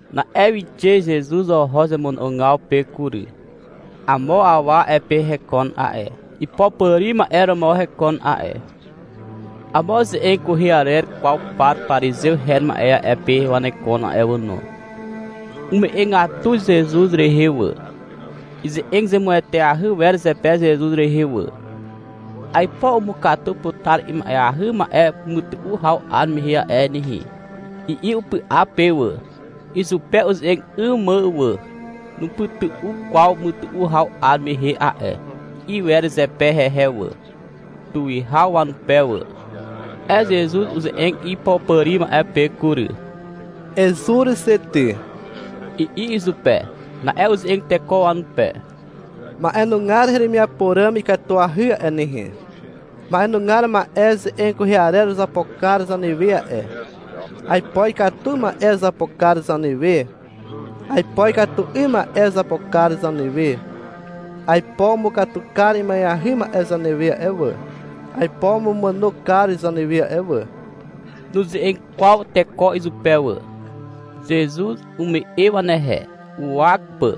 Na'e wixe Zezuz oho zemono'ogaw pe kury. Amo awa a'e pe hekon a'e. Ipopàri ma'e romo hekon a'e. Amo ze'eg kwehe arer kwaw par parizew her ma'e a'e pe wanekon a'e wà no. Ume'egatu Zezuz rehe wà. Ize'eg zemueteahy wer zepe Zezuz rehe wà. — Aipo umukatu putar ima'eahy ma'e mytu'u haw 'ar mehe a'e nehe, i'i upy'a pe wà, izupe uze'eg 'ym mà wà. — Nupytu'u kwaw mytu'u haw 'ar mehe a'e, i'i wer zepe hehe wà, tuwihaw wanupe wà. Na'e Zezuz uze'eg ipopàri ma'e pe kury. — Ezur xe ty, i'i izupe. Na'e uze'eg teko wanupe. — Ma'enugar heremiapo ràm ikatuahy a'e nehe. Ma'enugar ma'e ze'eg kwehe arer uzapo kar zanewe a'e. Aipo ikatu ma'e uzapo kar zanewe, aipo ikatu 'ym ma'e uzapo kar zanewe. Aipo umukatu kar ima'eahy ma'e zanewe a'e wà. Aipo umumàno kar zanewe a'e wà. Nuze'eg kwaw teko izupe wà. Zezuz ume'e wanehe, uwak pà,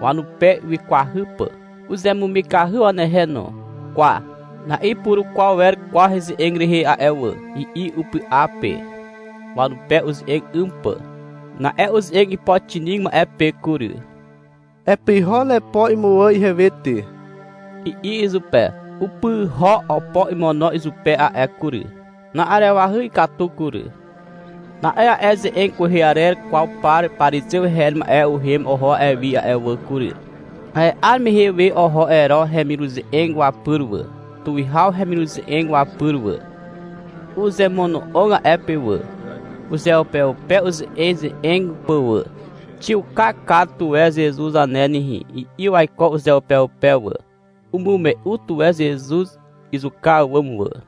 wanupe wikwahy pà. Uzemumikahy wanehe no. — Kwa, na'ipurukwaw wer kwaw heze'eg rehe a'e wà, i'i upy'a pe, wanupe uze'eg 'ym pà. Na'e uze'eg ipoxinig ma'e pe kury. — Epyho nepo imuwà ihewe ty, i'i izupe. Upyho opo imono izupe a'e kury. Na'arewahy ikatu kury. Na'e a'e ze'eg kwehe arer kwaw par parizew her ma'e uhem oho a'e wi a'e wà kury. A'e 'ar mehe we oho Ero hemiruze'eg wapyr wà, tuwihaw hemiruze'eg wapyr wà. Uzemono'og a'e pe wà, uzeupeupe uze'eze'eg pà wà. — Xiuka kar tuwe Zezuz zane nehe, i'i waiko uzeupeupe wà. Umume'u tuwe Zezuz izuka àwàm wà.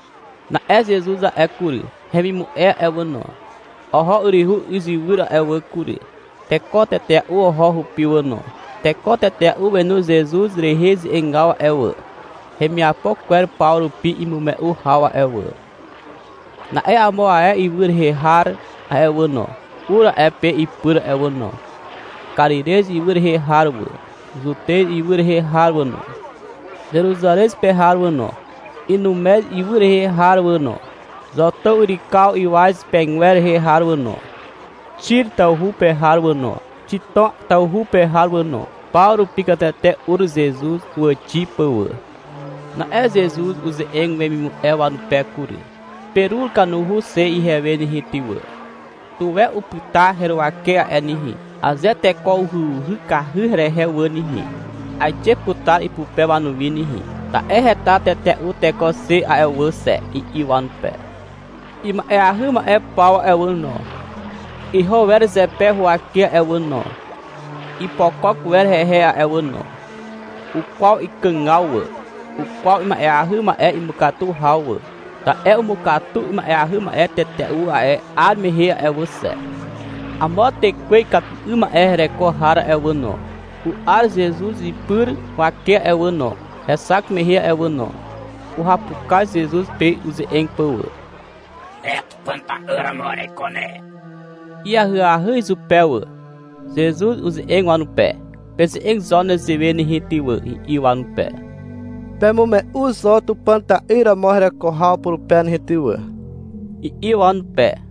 Na'e Zezuz a'e kury, hemimu'e a'e wà no, oho yryhu izywyr a'e wà kury. Teko tetea'u oho hupi wà no. Teko tetea'u wenu Zezuz rehe ze'egaw a'e wà, hemiapo kwer paw rupi imume'u haw a'e wà. Na'e amo ae ywy rehe har a'e wà no, ur a'e pe ipyr a'e wà no. Karirez ywy rehe har wà, Zutez ywy rehe har wà no, Zeruzarez pe har wà no, Inumez ywy rehe har wà no, Zotàw yrykaw ywaz pegwer rehe har wà no, Xir tawhu pe har wà no, Xitom tawhu pe har wà no. Paw rupi katete ur Zezuz huwàxi pà wà. Na'e Zezuz uze'eg wemimu'e wanupe kury. — Perur kanuhu xe ihewe nehe ty wà. Tuwe upyta heruwake a'e nehe. Aze teko uhyuhykahy herehe wà nehe, aixe putar ipupe wanuwi nehe. Ta'e heta tetea'u teko xe a'e wà xe, i'i wanupe. Ima'eahy ma'e paw a'e wà no, iho wer zepe huwake a'e wà no. Ipokok wer hehe a'e wà no. Ukwaw ikàgaw wà, ukwaw ima'eahy ma'e imukatu haw wà, ta'e umukatu ima'eahy ma'e tetea'u a'e 'ar mehe a'e wà xe. Amo tekwe ikatu 'ym ma'e hereko har a'e wà no, u'ar Zezuz ipy huwake a'e wà no, hexak mehe a'e wà no. Uhapukaz Zezuz pe uze'eg pà wà. — Ne Tupàn ta'yr romo ereiko ne, i'i ahyahy izupe wà. Zezuz uze'eg wanupe. — Peze'eg zo nezewe nehe ty wà, i'i wanupe. — Pemume'u zo Tupàn ta'yr romo hereko haw purupe nehe ty wà, i'i wanupe.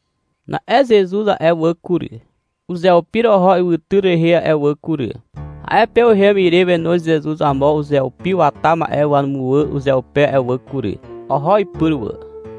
Na'e Zezuz a'e wà kury, uzeupir oho ywytyr rehe a'e wà kury. A'e pe uhem ire wenoz Zezuz amo uzeupi wata ma'e wamuwà uzeupe a'e wà kury. Oho ipyr wà.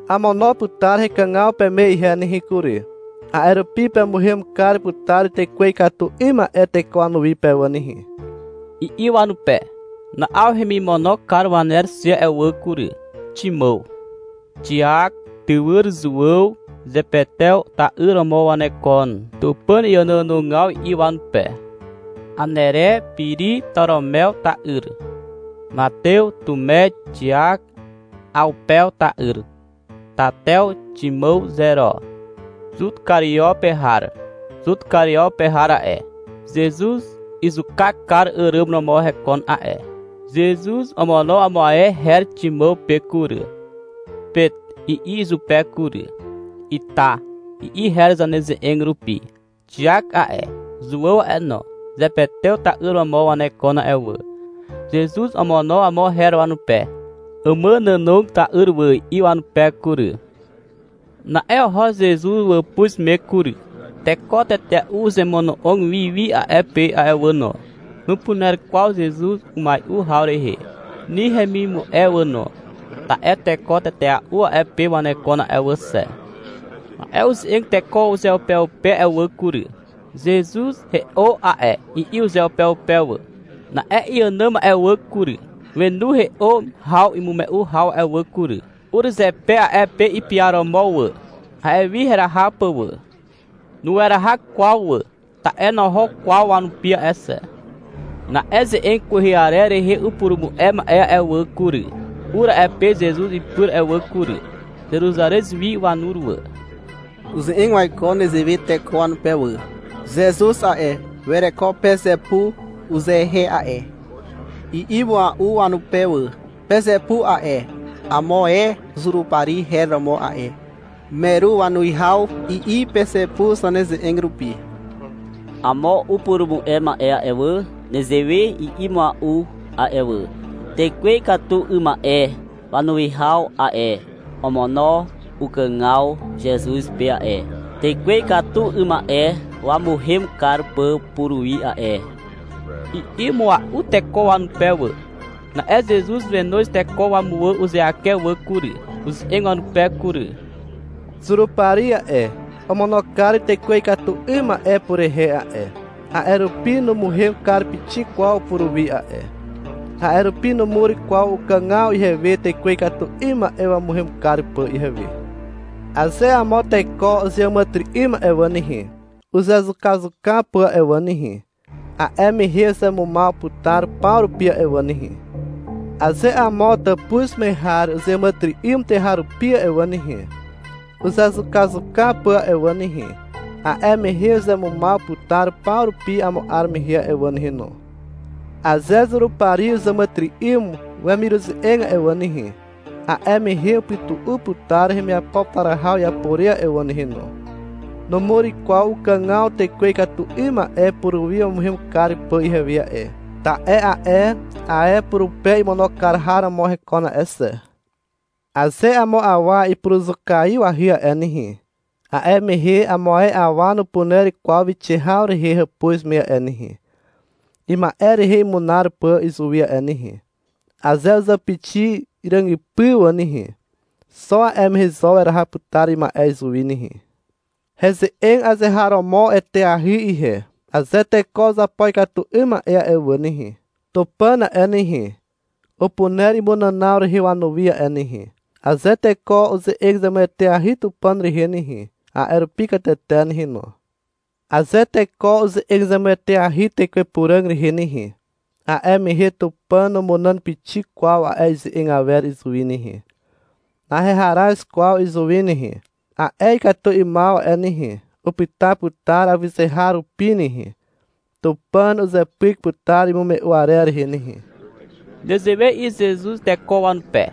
— Amono putar hekàgaw peme ihe nehe kury. A'e rupi pemuhem kar putar tekwe ikatu 'ym ma'e teko wanuwi pe wà nehe, i'i wanupe. Na'aw hemimono kar waner xe a'e wà kury. Ximàw, Xiak, tywyr Zuàw, Zepetew ta'yr romo wanekon (Tupàn iànoànogaw i'i wanupe), Anere, Piri, Toromew ta'yr, Matew, Tume, Xiak Awpew ta'yr, Tatew, Ximàw Zero, Zut Kario pe har. (Zut Kario pe har a'e, Zezuz izuka kar àràm romo hekon a'e.) Zezuz omono amo ae her Ximàw pe kury. — Pet, i'i izupe kury. (— Ita, i'i her zaneze'eg rupi.) Xiak a'e, Zuàw a'e no, Zepetew ta'yr romo wanekon a'e wà. Zezuz omono amo her wanupe. — Àmànànog ta'yr wà, i'i wanupe kury. Na'e oho Zezuz wàpuz me kury. Teko tetea'u uzemono'og wi wi a'e pe a'e wà no. Nupuner kwaw Zezuz umai'u haw rehe, ni hemimu'e wà no. Ta'e teko tetea'u a'e pe wanekon a'e wà xe. Na'e uze'eg teko uzeupeupe a'e wà kury. — Zezuz he'o a'e, i'i uzeupeupe wà. Na'e iànàm a'e wà kury, wenu he'o haw imume'u haw a'e wà kury. Ur zepe a'e pe ipiaromo wà, a'e wi heraha pà wà. (Nueraha kwaw wà. Ta'e noho kwaw wanupi a'e xe.) Na'e ze'eg kwehe arer rehe upurumu'e ma'e a'e wà kury, ur a'e pe Zezuz ipyr a'e wà kury. Zeruzarez wi wanur wà. Uze'eg waiko nezewe teko wanupe wà. — Zezuz a'e, wereko Pezepu uzehe a'e, i'i mua'u wanupe wà. (Pezepu a'e, amo ae Zurupari her romo a'e. Meru wanuwihaw, i'i Pezepu zaneze'eg rupi.) Amo upurumu'e ma'e a'e wà, nezewe i'i mua'u a'e wà. — Tekwe ikatu 'ym ma'e wanuwihaw a'e, omono ukàgaw Zezuz pe a'e, tekwe ikatu 'ym ma'e wamuhem kar pà puruwi a'e, i'i mua'u teko wanupe wà. Na'e Zezuz wenoz teko wamuwà uzeake wà kury. Uze'eg wanupe kury. — Zurupari a'e, omono kar tekwe ikatu 'ym ma'e purehe a'e. A'e rupi numuhem kar pixik kwaw puruwi a'e. A'e rupi numur kwaw ukàgaw ihewe tekwe ikatu 'ym ma'e wamuhem kar pà ihewe. Aze amo teko uzeàmàtyry'ym a'e wà nehe, uzezukazuka pà a'e wà nehe, a'e mehe uzemumaw putar paw rupi a'e wà nehe. Aze amo tàpuz me har uzeàmàtyry'ym tuweharupi a'e wà nehe, uzezukazuka pà a'e wà nehe, a'e mehe uzemumaw putar paw rupi amo 'ar mehe a'e wà nehe no. Aze Zurupari uzàmàtyry'ym wemiruze'eg a'e wà nehe, a'e mehe upytu'u putar hemiapo putar haw iapo re a'e wà nehe no. Numur kwaw ukàgaw tekwe ikatu 'ym ma'e puruwi wamuhem kar pà ihewe a'e, ta'e a'e ae purupe imono kar har romo hekon a'e xe. Aze amo awa ipuruzukaiwahy a'e nehe, a'e mehe amo ae awa nupuner kwaw wixe haw rehe hàpuz me a'e nehe, ima'e rehe imunar pà izuwi a'e nehe. Aze uzàpixi ràgypy wà nehe, xo a'e mehe zo weraha putar ima'e izuwi nehe. Heze'eg azeharomo eteahy ihe. Aze teko uzapo ikatu 'ym ma'e wà nehe, Tupàn a'e nehe, upuner imunànaw rehe wanuwi a'e nehe. Aze teko uze'eg zemueteahy Tupàn rehe nehe, a'e rupi katete nehe no. Aze teko uze'eg zemueteahy Tekwe Puràg rehe nehe, a'e mehe Tupàn numunàn pixik kwaw a'e ize'eg awer izuwi nehe. Naheharaz kwaw izuwi nehe. A'e ikatu 'ymaw a'e nehe, upyta putar awyzeharupi nehe. Tupàn uzepyk putar imume'u arer rehe nehe. Nezewe i'i Zezuz teko wanupe,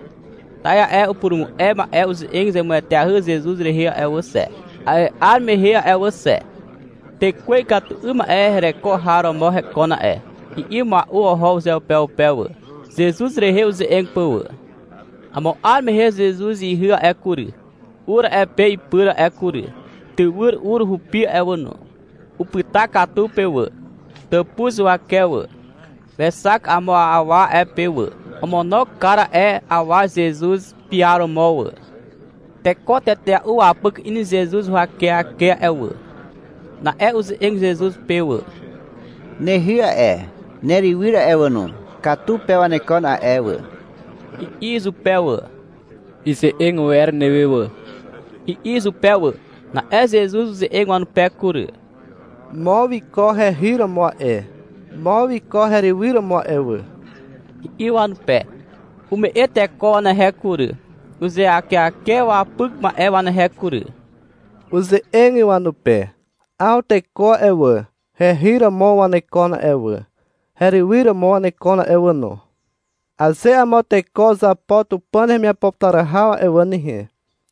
ta'e a'e upurumu'e ma'e uze'eg zemueteahy Zezuz rehe a'e wà xe, a'e 'ar mehe a'e wà xe. — Tekwe ikatu 'ym ma'e hereko har romo hekon a'e, i'i mua'u oho uzeupeupe wà, Zezuz rehe uze'eg pà wà. Amo 'ar mehe Zezuz ihy a'e kury, ur a'e pe ipyr a'e kury. Tywyr ur hupi a'e wà no. Upyta katu pe wà, tàpuz huwake wà. Wexak amo awa a'e pe wà. Omono kar a'e awa Zezuz piaromo wà. Teko tetea'u wapyk in Zezuz huwakeake a'e wà. Na'e uze'eg Zezuz pe wà. — Nehy a'e, nerywyr a'e wà no, katu pe wanekon a'e wà, i'i izupe wà. — Ize'eg wer newe wà, i'i izupe wà. Na'e Zezuz uze'eg wanupe kury. — Mo wiko hehy romo a'e. Mo wiko herywyr romo a'e wà, i'i wanupe. Ume'e teko wanehe kury, uzeakeake wapyk ma'e wanehe kury. Uze'eg wanupe. 'Aw teko a'e wà, hehy romo wanekon a'e wà, herywyr romo wanekon a'e wà no. Aze amo teko uzapo Tupàn hemiapo putar haw a'e wà nehe,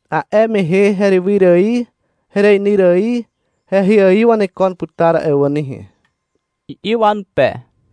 a'e mehe herywyr ài hereinyr ài hehy ài wanekon putar a'e wà nehe, i'i wanupe.